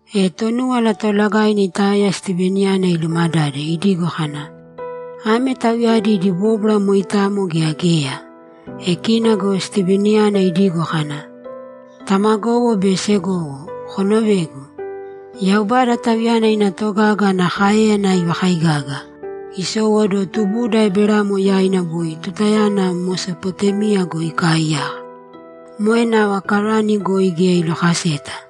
E Tonúwala Toolagaina itaoya Stiveniyana ilumadade, idigo kana, ‘Ame tauyadi idi bóbwara moitamo gea geya?’ E kina go Stiveniyana idigo kana, ‘Tamagowo be segowo, konovēgu! Yaubada, Tauyana ina togaga ana káeyana ivakaigaga, isowóduwo tubuda Eberamo yaina boi tutayana Mesopotémia goi ikaaiyaka. Moe nava Karani goi geya ilokaseta.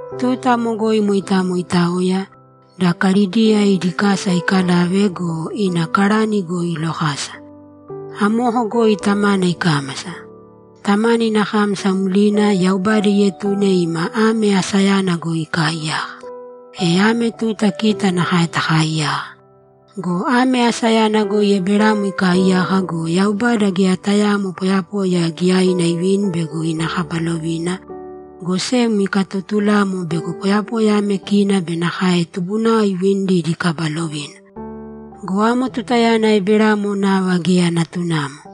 Tuta amo goi moitamo itaoya, da Kalidia idi kasa ikalave go, ina Karani goi ilokasa. Amoko goi tamana ikámasa. Tamana ina kámasa mlina, Yaubada ietune ima ame asayana goi ikaiyaka, e ame tuta kita nakae takaaiyaka. Go ame asayana goi Eberamo ikaaiyaka go, Yaubada geya tayaamo poyapoya giyaina ivini bego ina kaba lovina, go sem ikatotulamo bego poyapoya ame kina be nakae tubunao ivinidi idi kaba lovina. Go amo tutayana Eberamo nava geya natunamo.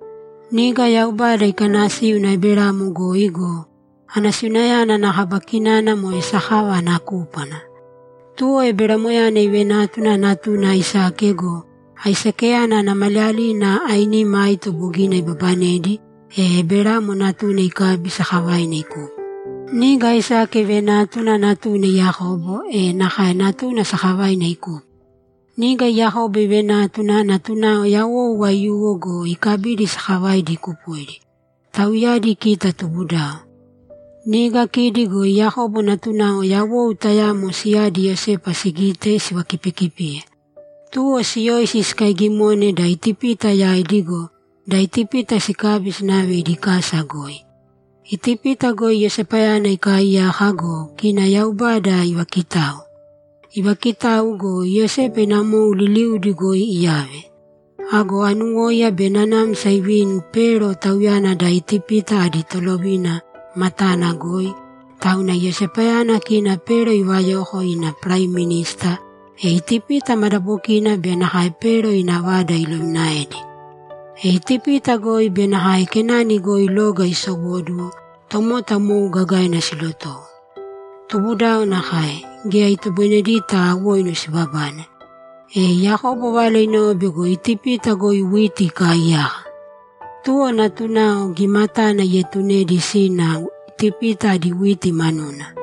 Niga Yaubada ikanasíuna Eberamo goi go, anasiunayana ana kaba kinana moe sakava ana kúpwana. Tuwo Eberamoyana ivenátuna natuna Aisake go, Aisakeyana ana maliyalina ainima aito bogina ibabanedi, e Eberamo natuna ikabi sakavaina ikupo. Niga Aisake ivenátuna natuna Yakobo, e nakae natuna sakavaina ikupo. Niga Yakobo ivenátuna natunao yawou aiyuwo go, ikabidi sakavaidi ikupoidi. Tauyadi kita tubudao. Niga kidi go Yakobo natunao yawou tayamo siyadi Iyosepa sigite, sivakipikipiye. Tuwo siyoisi sikaigimone da Itipita yaidi go, da Itipita sikabi sinave idi kasa goi. Itipita goi Iyosepayana ikaaiyaka go, kina Yaubada ivaakitau. Ivaakitau go, Iyosepa ina mou liliudi goi iyave. Ago anuwóiya be nanamsa ivini Pero, tauyana da Itipita adi tolovina, matana goi, tauna Iyosepayana kina Pero ivayoko ina paraiminista, e Itipita madabokina be nakae Pero ina vada ilovinaedi. E Itipita goi be nakae Kenani goi loga isowóduwo, tomota mou gagaina silotowo. Tubudao nakae, geya itoboinedita awoinu sibabane. E Yakobo vala inove bego Itipita goi witi ikaaiyaka. Tuwo natunao gimatana ietunedi sina Itipita adi witi manuna.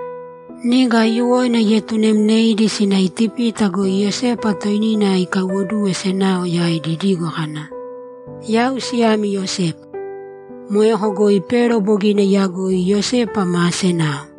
Niga aiyuwoina ietunemneidi sina Itipita goi Iyosepa toinina ikaiwoduwe senao yaidi idigo kana, “Yau siyami Iyosepa.” Moeko goi Pero bogina iyagoi Iyosepa maa senao.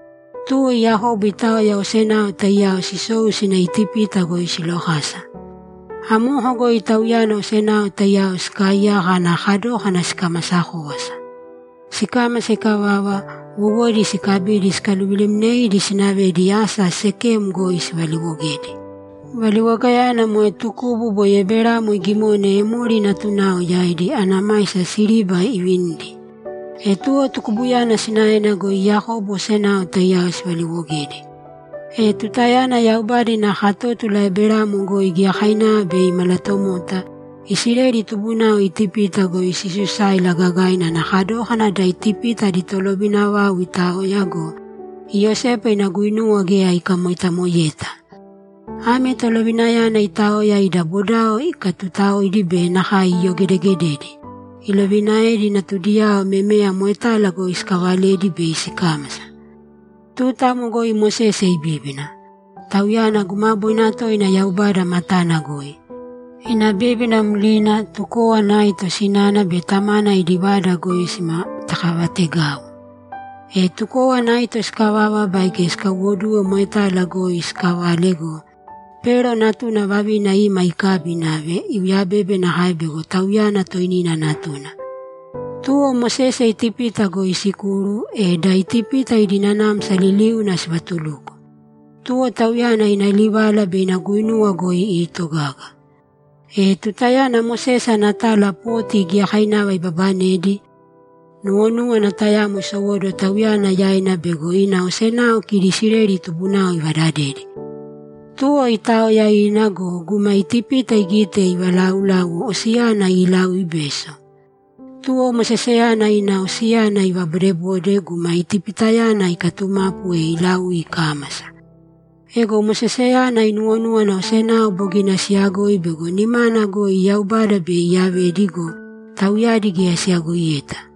Tuwo Yakobo itaoya osenao taiyao sisou sina Itipita goi silokasa. Amoko goi Tauyana osenao taiyao sikaaiyaka ana kadókana sikamasa kówasa. Sikámasa ikavava, wowodi sikabidi sikaluvilemneidi sinavedi asa Sekem goi sivaliwogedi. Valiwogayana moe tukubu boi Eberamo igimone Emori natunao yaidi, ana maisa siriba ivinidi. E tuwo tukubuyana sinaena goi Yakobo osenao taiyao sivaliwogedi. E tutayana Yaubada ina katótula Eberamo goi giyakainava bei imalatomota, Isileli tubunao Itipita goi sisusáila gagaina ana kadókana da Itipita adi tolovina vau itaoya go, Iyosepa ina guinuwa geya ikamoitamoeyeta. Ame tolovinayana itaoya ida bodao ikatutaoidi be nakae iyogedegededi; ilovinaedi natudiyao memeya moetala goi sikalavedi bei sikámasa. Tuta amo goi Mosese ibíbina. Tauyana gumaboina toina Yaubada matana goi. Ina bíbina mlina, tukówana aito sinana be tamana idi vada goi simatakavategau. E tukówana aito sikavava baige sikaiwoduwe moetala goi sikalave go, Pero natuna vavina ima ikabi inave, iuyabebe nakae bego tauyana toinina natuna. Tuwo Mosese Itipita goi isikuru, e da Itipita idi nanamsa liliuna sivatuluko. Tuwo tauyana ina livala be ina guinuwa goi iitogaga. E tutayana Mosese ana tala poti giyakainava ibabanedi, nuwonúwana tayamo isowóduwo tauyana yaina bego ina osenao kidi Isileli tubunao ivadadedi. Tuwo itaoya ina go, guma Itipita igite ivalauláuwo, osiyana iilaui beso. Tuwo Moseseyana ina osiyana ivabodebode, guma Itipitayana ikatumapu, e ilaui ikámasa. Ego Moseseyana inuwonúwana osenao bogina siyagoi bego nimana goi Yaubada bei iyavedi go, tauyadi geya siyagoiyeta.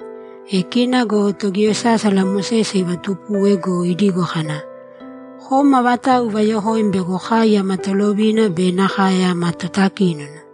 E kina go togiyosásala Mosese ivatupuwe go, idigo kana, “Kom avatau ivayokoim bego kai ama tolovina be nakae ama totakínona?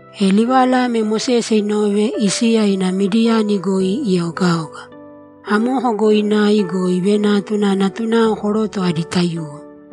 E livala ame Mosese inove, isiya ina Midiyani goi ieogaoga. Amoko goi inai go, ivenátuna natunao koroto adi taiyuwo.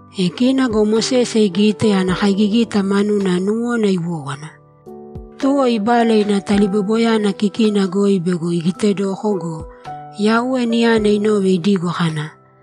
E kina go Mosese igite, ana kaigigita manuna nuwona iwówana. Tuwo ibala ina taliboiboyana kikina goi bego igitedoko go, Yauwe niyana inove idigo kana,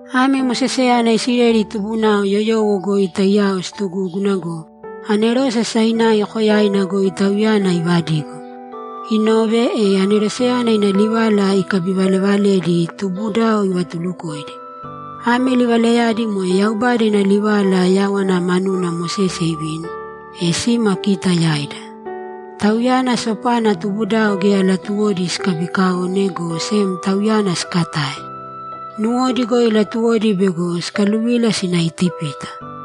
Ame Moseseyana Isileli tubunao yoyowo goi taiyao situgúguna go, anerose Sainai koyaina goi tauyana ivadigo. Inove, e aneroseyana ina livala ikabivalevaledi, tubudao ivatulukoidi. Ame livalayadi moe Yaubada ina livala yáwana manuna Mosese ivini, e sima kita yaida. Tauyana sopana tubudao geya latuwodi sikabikaone, go sem tauyana sikatae; nuwodi goi latuwodi bego sikaluvila sina Itipita.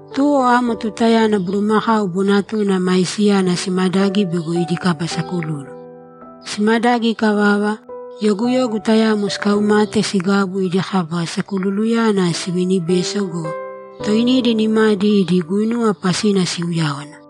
Tuwo amo tutayana bulumakau bonatuna maisiyana simadagi bego idi kaba sakululu. Simadagi ikavava, yoguyogu tayamo sikaumate sigabu idi kaba sakululuyana sivinibeso go, toinidi nimadi idi guinuwa pasina siuyáwana.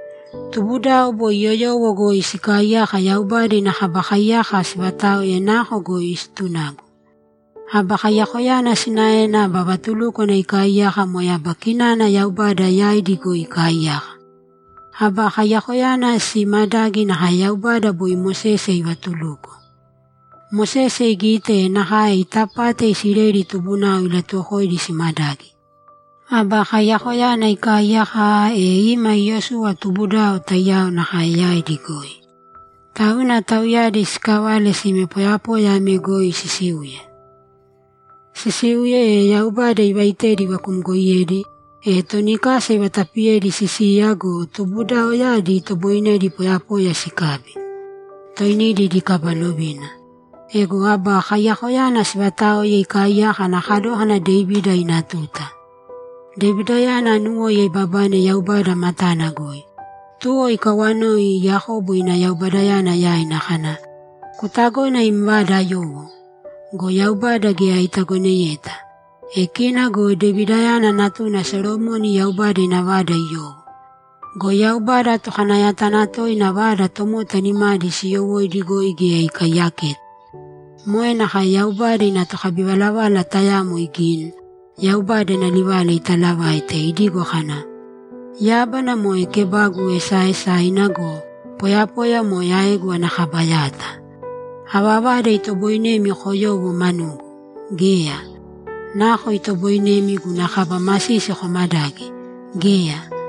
Tubudao boi yoyowo goi sikaaiyaka Yaubada ina Kaba Kaiyaka sivataoe nako goi situnagu. Aba Kaiyakoyana sinaena aba vatulúkwana ikaaiyaka moe aba kinana Yaubada yaidi goi ikaaiyaka. Aba Kaiyakoyana siimadagi nakae Yaubada boi Mosese ivatuluko. Mosese igite, e nakae itapate Isileli tubunao ilatuwokoidi simadagi. Aba Kaiyakoyana ikaiyaka aaa, e ima Iyosuwa tubudao taiyao nakae yaidi goi. Tauna tauyadi sikavale sime poyapoya ame goi sisiuye. Sisiuye, e Yaubada ivaitedi ivakumgoiyedi, e toni kasa ivatapiyedi sisiya go, tubudaoyadi itoboinedi poyapoya sikabi, toinidi idi kaba lovina. Ego Aba Kaiyakoyana sivataoe ikaaiyaka ana kadókana Devida ina tuta. Devidayana anuwóiya ibabane Yaubada matana goi. Tuwo ikawanoi Yakobo ina Yaubadayana yaina kana, “Kutagona im vada ayowo?” Go Yaubada geya itagoneyeta. E kina go Devidayana natuna Solomoni Yaubada ina vada iyowo. Go Yaubada Tokanayatanatoina vada tomota nimadi siiyowóidi goi geya ikaiyaketa. Moe nakae Yaubada ina tokabivalavala tayamo igini, Yaubada ina livala italavaite, idigo kana, “Yábana moe kebagu esaaesaina go, poyapoya moe aegu ana kaba yata. Ava vada itoboinemi koyowo manugu? Geya! Nako itoboinemi guna kaba masisi komadagi? Geya!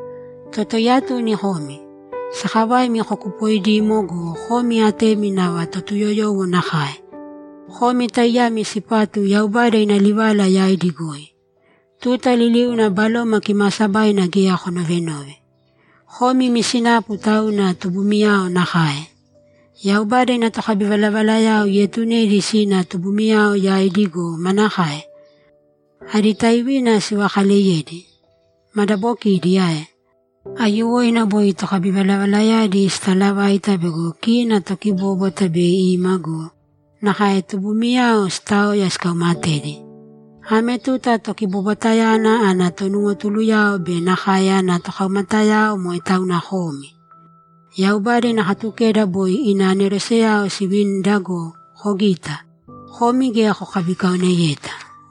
Totaiyatuni komi! Sakavaimi kokupoidimo go, komi atemi nava Totuyoyowo nakae! Komi taiyami sipatu Yaubada ina livala yaidi goi. Tuta liliuna Baloma Kimaasabaina geya konovenove. Komi imi sinapu tauna tubumiyao nakae! Yaubada ina tokabivalavalayao ietunedi sina tubumiyao yaidi go, manakae? Adi taivina sivakaleyedi? Madabokidi ae? Aiyuwoina boi tokabivalavalayadi sitalavaita bego kina Tokibóbwata bei ima go, nakae tubumiyao sitaoya sikaumatedi. Ame tuta Tokibobwatayana ana tonuwotuluyao be nakae ana tokaumatayao moe tauna komi! Yaubada ina Katukeda boi ina aneroseyao sivinida go, kogita, komi geya kokabikaoneyeta!’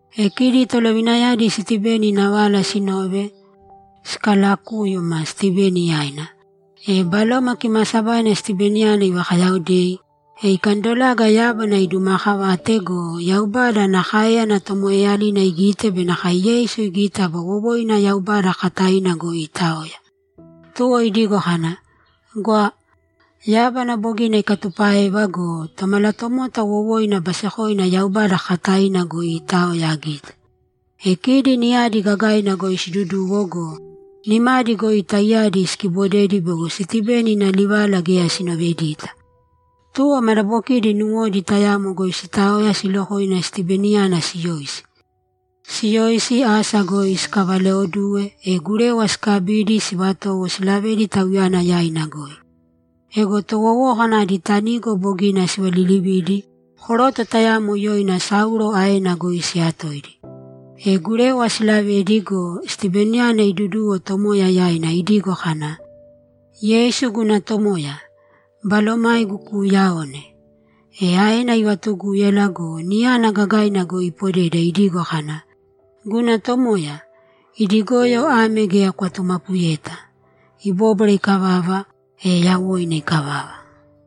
E kidi tolovinayadi Stiveni ina vala sinove, sikalakúyuma Stiveni yaina. E Baloma Kimaasabaina Stiveniyana ivakayaodei, e ikandolaga yábana idumakavate go, Yaubada ana káeyana tomoeeyalina igite be nakae Yeisu igite aba wowoina Yaubada kakataina goi iitaoya. Tuwo idigo kana, ‘Gwa! Yábana bogina ikatupáeva go, Tomalatomota wowoina basekoina Yaubada kakataina goi iitaoya agite.’ E kidi niyadi gagaina goi siduduwo go, nimadi goi taiyadi sikibodedi bego Stiveni ina livala geya sinovedita. Tuwo madabokidi nuwodi tayamo goi sitaoya silokoina Stiveniyana siyoisi. Siyoisi, asa goi sikavalaoduwe, e gurewa sikabidi, sivatowo silavedi tauyana yaina goi. Ego towowókana adi tanigo bogina sivalilividi, koroto tayamo yoina Saulo aena goi siyatoidi. E gurewa siilavedi go, Stiveniyana iduduwo Tomoya yaina idigo kana, ‘Yeisu guna Tomoya, balomaigu kuuyaone!’ E aena ivatugúyala go, niyana gagaina goi ipodeda idigo kana, ‘Guna Tomoya, idi goyo ame geya kwatumapuyeta!’ Ibóbwara ikavava, e yawoina ikavava.